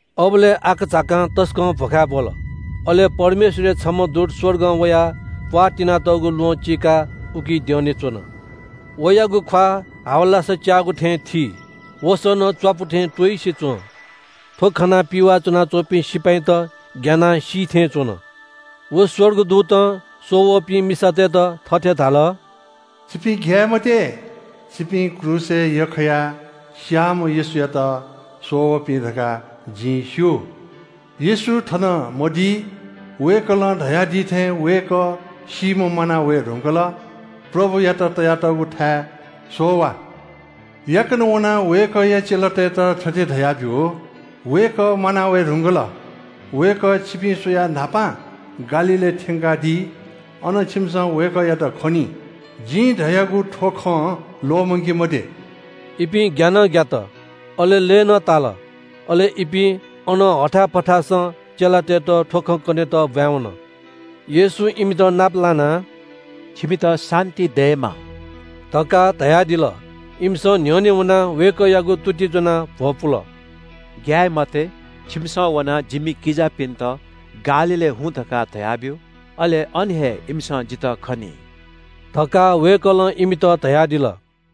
अबलय् आकाझाकां तसकं भ्‍वखाय् ब्‍वल। अले परमेश्‍वरया छम्‍ह दूत स्‍वर्गं वयाः प्‍वाः तिनातःगु ल्‍वहं चीकाः उकी द्यःने च्‍वन। वयागु ख्‍वाः हावलासा च्‍याःगु थें थी, वसः नं च्‍वापु थें त्‍वइसे च्‍वं। थ्‍व खनाः पिवाः च्‍वनाच्‍वंपिं सिपाइँत ग्‍यानाः सी थें च्‍वन। व स्‍वर्गदूतं स्‍वः वःपिं मिसातय्‌त थथे धाल – “छिपिं ग्‍याये मते। छिपिं क्रूसय् यख्‍खायाः स्‍याःम्‍ह येशूयात स्‍वः वःपिं धकाः जिं स्‍यू। येशू थन मदी। वय्‌कलं धयादी थें वय्‌कः सीम्‍हं म्‍वाना वये धुंकल। प्रभुयात तयातःगु थाय् स्‍वः वा। याकनं वनाः वय्‌कःया चेलातय्‌त थथे धयाब्‍यु – ‘वय्‌कः म्‍वाना वये धुंकल। वय्‌कः छिपिं स्‍वयाः न्‍हापां गालीलय् थ्‍यंकादी। अन छिमिसं वय्‌कःयात खनी।’ जिं धयागु थ्‍व खँ ल्‍वःमंके मते।” इपिं ग्‍या नं ग्‍यात, अले लय् नं ताल। अले इपिं अनं हथाय् पथासं चेलातय्‌त थ्‍व खँ कनेत ब्‍वाँय् वन। येशूं इमित नाप लानाः “छिमित शान्‍ति दयेमा” धकाः धयादिल। इमिसं न्‍ह्यःने वनाः वय्‌कःयागु तुति ज्‍वनाः भ्‍वपुल। “ग्‍याये मते, छिमिसं वनाः जिमि किजापिन्‍त ‘गालीलय् हुँ’ धकाः धयाब्‍यु। अले अन हे इमिसं जितः खनी” धकाः वय्‌कलं इमित धयादिल।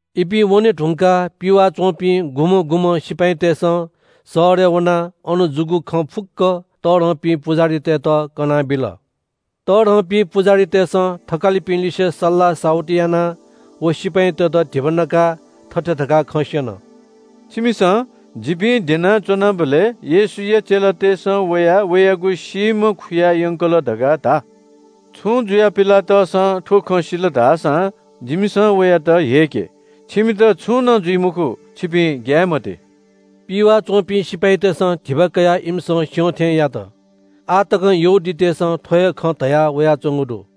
इपिं वने धुंकाः पिवाः च्‍वंपिं गुम्‍हं गुम्‍हं सिपाइँतय्‌सं शहरय् वनाः अन जूगु खँ फुक्‍क तःधंपिं पुजाहारीतय्‌त कनाबिल। तःधंपिं पुजाहारीतय्‌सं थकालिपिं लिसे सल्‍लाह साहुति यानाः व सिपाइँतय्‌त धिबा नकाः थथे धकाः खँ स्‍यन – “छिमिसं ‘जिपिं द्यनाच्‍वनाबलय् येशूया चेलातय्‌सं वयाः वयागु सीम्‍ह खुयायंकल’ धकाः धा। छुं जुयाः पिलातसं थ्‍व खँ सिल धाःसां जिमिसं वयात ह्यय्‌के। छिमित छुं नं जुइ मखु, छिपिं ग्‍याये मते।” पिवाः च्‍वंपिं सिपाइँतय्‌सं धिबा कयाः इमिसं स्‍यं थें यात। आः तकं यहूदीतय्‌सं थ्‍व हे खँ धयावयाच्‍वंगु दु।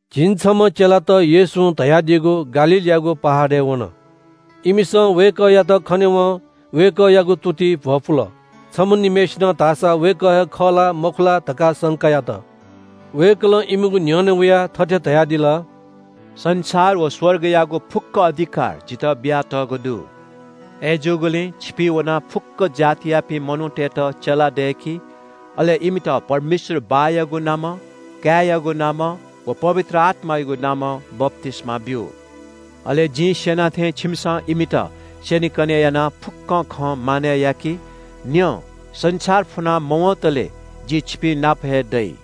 झिंछम्‍ह चेलात येशूं धयादीगु गालीलयागु पहाडय् वन। इमिसं वय्‌कःयात खनेवं वय्‌कःयागु तुतिइ भ्‍वपुल। छम्‍ह निम्‍हय्‌सिनं धाःसा वय्‌कः हे खः ला मखु ला धकाः संका यात। वय्‌कलं इमिगु न्‍ह्यःने वयाः थथे धयादिल – “संसार व स्‍वर्गयागु फुक्‍क अधिकार जितः बियातःगु दु। अय्‌जूगुलिं छिपिं वनाः फुक्‍क जातियापिं मनूतय्‌त चेला दय्‌कि। अले इमित परमेश्‍वर बाःयागु नामं, काय्‌यागु नामं व पवित्र आत्‍मायागु नामं बप्‍तिस्‍मा ब्‍यु। अले जिं स्‍यना थें छिमिसं इमित स्‍यनेकने यानाः फुक्‍कं खँ मानय् याकि। न्‍यँ, संसार फुना मवंतले जि छिपिंनाप हे दइ।”